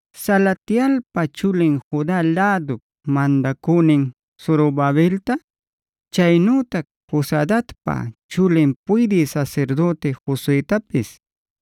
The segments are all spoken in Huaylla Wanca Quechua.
“Salatielpa chulin Juda lädup mandacünin Zorobabelta, chaynütac Josadacpa chulin puydï sasirdüti Josuetapis,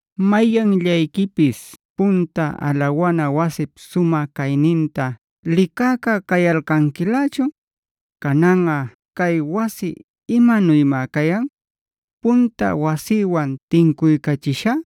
‘¿Mayanllayquipis punta alawana wasip sumä cayninta licäca cayalcanquilächun? Cananꞌa ¿cay wasi imanuymá cayan? Punta wasïwanb tincuycachishá,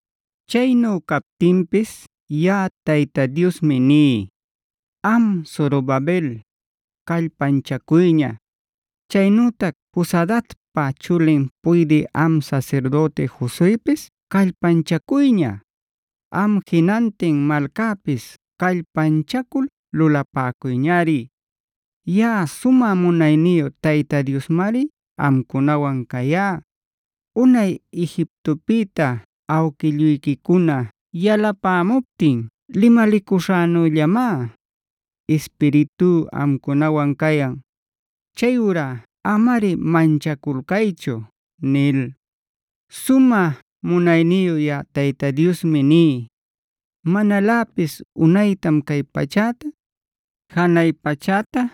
“Chaynu captinpis yaꞌa Tayta Diosmi ní: ‘Am Zorobabel, callpanchacuyña. Chaynütac Josadacpa chulin puydï am sasirdüti Josuepis callpanchacuyña. Am jinantin malcäpis callpanchacul lulapäcuyñari. Yaꞌa sumä munayniyu Tayta Diosmari amcunawan cayá. Unay Egiptopïta awquilluyquicuna yalapämuptin limalicuśhänüllamá,d Ispiritú amcunawan cayan. Chayurá amari manchaculcaychu’ nil. “Sumä munayniyu yaꞌa Tayta Diosmi ní: Manaläpis unaytam cay pachäta, janay pachäta,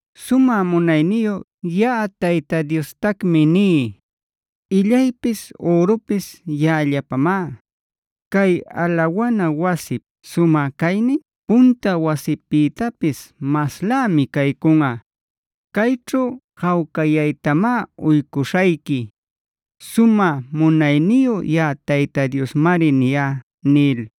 “Sumä munayniyu yaꞌa Tayta Diostacmi ní: Illaypis ürupis yaꞌallapamá. Cay alawana wasip sumä caynin punta wasipïtapis maslämi caycunꞌa. Cayćhu jawcayaytamá uycuśhayqui. Sumä munayniyu yaꞌa Tayta Diosmari niyá” nil.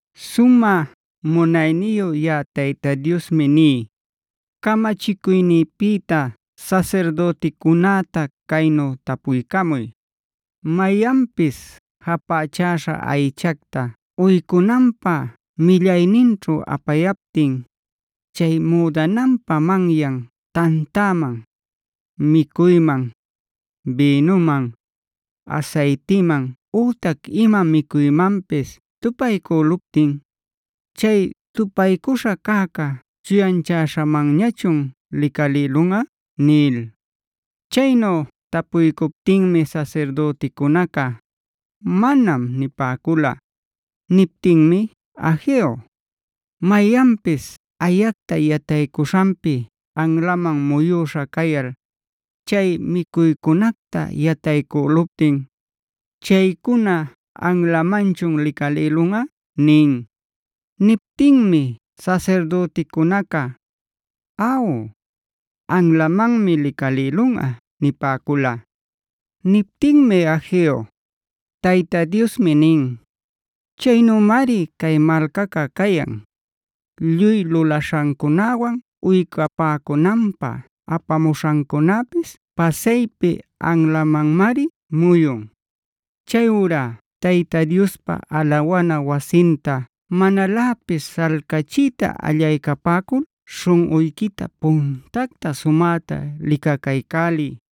“Sumä munayniyu yaꞌa Tayta Diosmi ní: Camachicuynïpïta sasirdüticunäta caynu tapuycamuy: ‘Mayanpis japächäśha aychacta uycunanpä millayninćhu apayaptin, chay müdananpa manyan tantaman, micuyman, bïnuman, asaytiman ütac ima micuymanpis tupaycüluptin, ¿chay tupaycuśha cäca chuyanchäśhamanñachun licalïlunꞌa?’” nil. Chaynu tapuycuptinmi sasirdüticunaca: “Manam” nipäcula. Niptinmi Hageo: “Mayanpis ayacta yataycuśhanpif anlaman muyüśha cayal, chay micuycunacta yataycüluptin, ¿chaycuna anlamanchun licalïlunꞌa?” nin. Niptinmi sasirdüticunaca: “Aw, anlamanmi licalïlunꞌa” nipäcula. Niptinmi Hageo: “Tayta Diosmi nin: ‘Chaynümari cay malcaca cayan. Lluy lulaśhancunawan uycapämänanpä apapämuśhancunapis pasaypi anlamanmari muyun. Chayurá Tayta Diospa alawana wasinta manaläpis śhalcachiyta allaycapäcul śhunꞌuyquita puntacta sumäta licacaycäliy.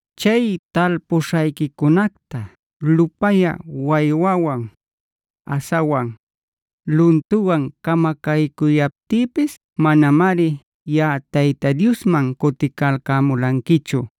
Chay talpuśhayquicunacta lupayä waywawan, asawan, luntuwan camacaycuyaptïpis manamari yaꞌa Tayta Diosman cuticalcämulanquichu.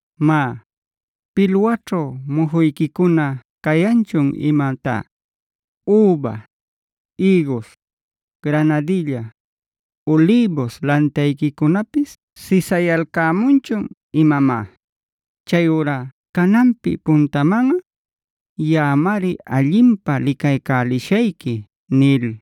Má, ¿pilwaćhu mujuyquicuna cayanchun imatá? ¿Üba, ïgus, granadilla, ulïbus lantayquicunapis sisayalcämunchun imamá? Chayurá cananpi puntamanꞌa, yaꞌamari allinpä licaycälishayqui’” nil.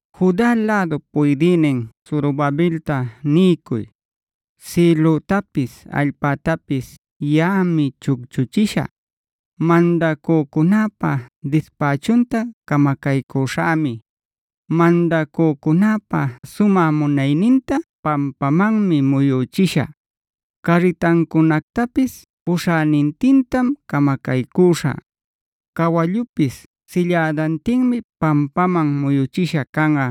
“Juda lädup puydïnin Zorobabelta niycuy: ‘Sïlütapis allpätapis yaꞌami chucchuchishä. Mandacücunäpa dispächunta camacaycüśhämi; mandacücunäpa sumä munayninta pampamanmi muyüchishä; carritancunactapis puśhänintintam camacaycüśhä. Cawallupis sillädantinmi pampaman muyüchisha canꞌa;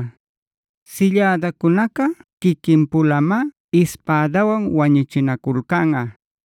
sillädacunaca quiquin-pulamá ispädawan wañuchinaculcanꞌa.